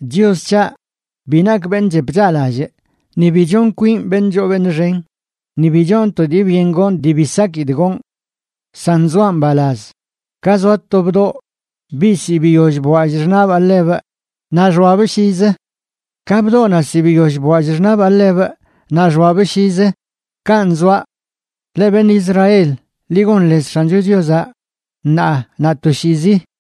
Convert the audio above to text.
Chios c̱haꞌ, bi nakꞌ beṉꞌ chep chaꞌlallꞌ, ni bi chonꞌ kwinꞌ beṉꞌ choo beṉꞌ xen, ni bi chonꞌ to dii byen gonꞌ dii bi sakidꞌ gonꞌ. San zoaꞌ mbalaz, ka zoa to bdoꞌ, biꞌ zi biyoll bwallꞌ xṉaꞌbaꞌ ḻebꞌ naꞌ xoabꞌ llizə. Ka bdoꞌnaꞌ zi biyoll bwallꞌ xṉaꞌbaꞌ ḻebꞌ naꞌ xoabꞌ llizə, kanꞌ zoaꞌ. Leꞌ beṉꞌ Israel, ḻi gon lez X̱ancho Chiozaꞌ ṉaa naꞌ toshiizi.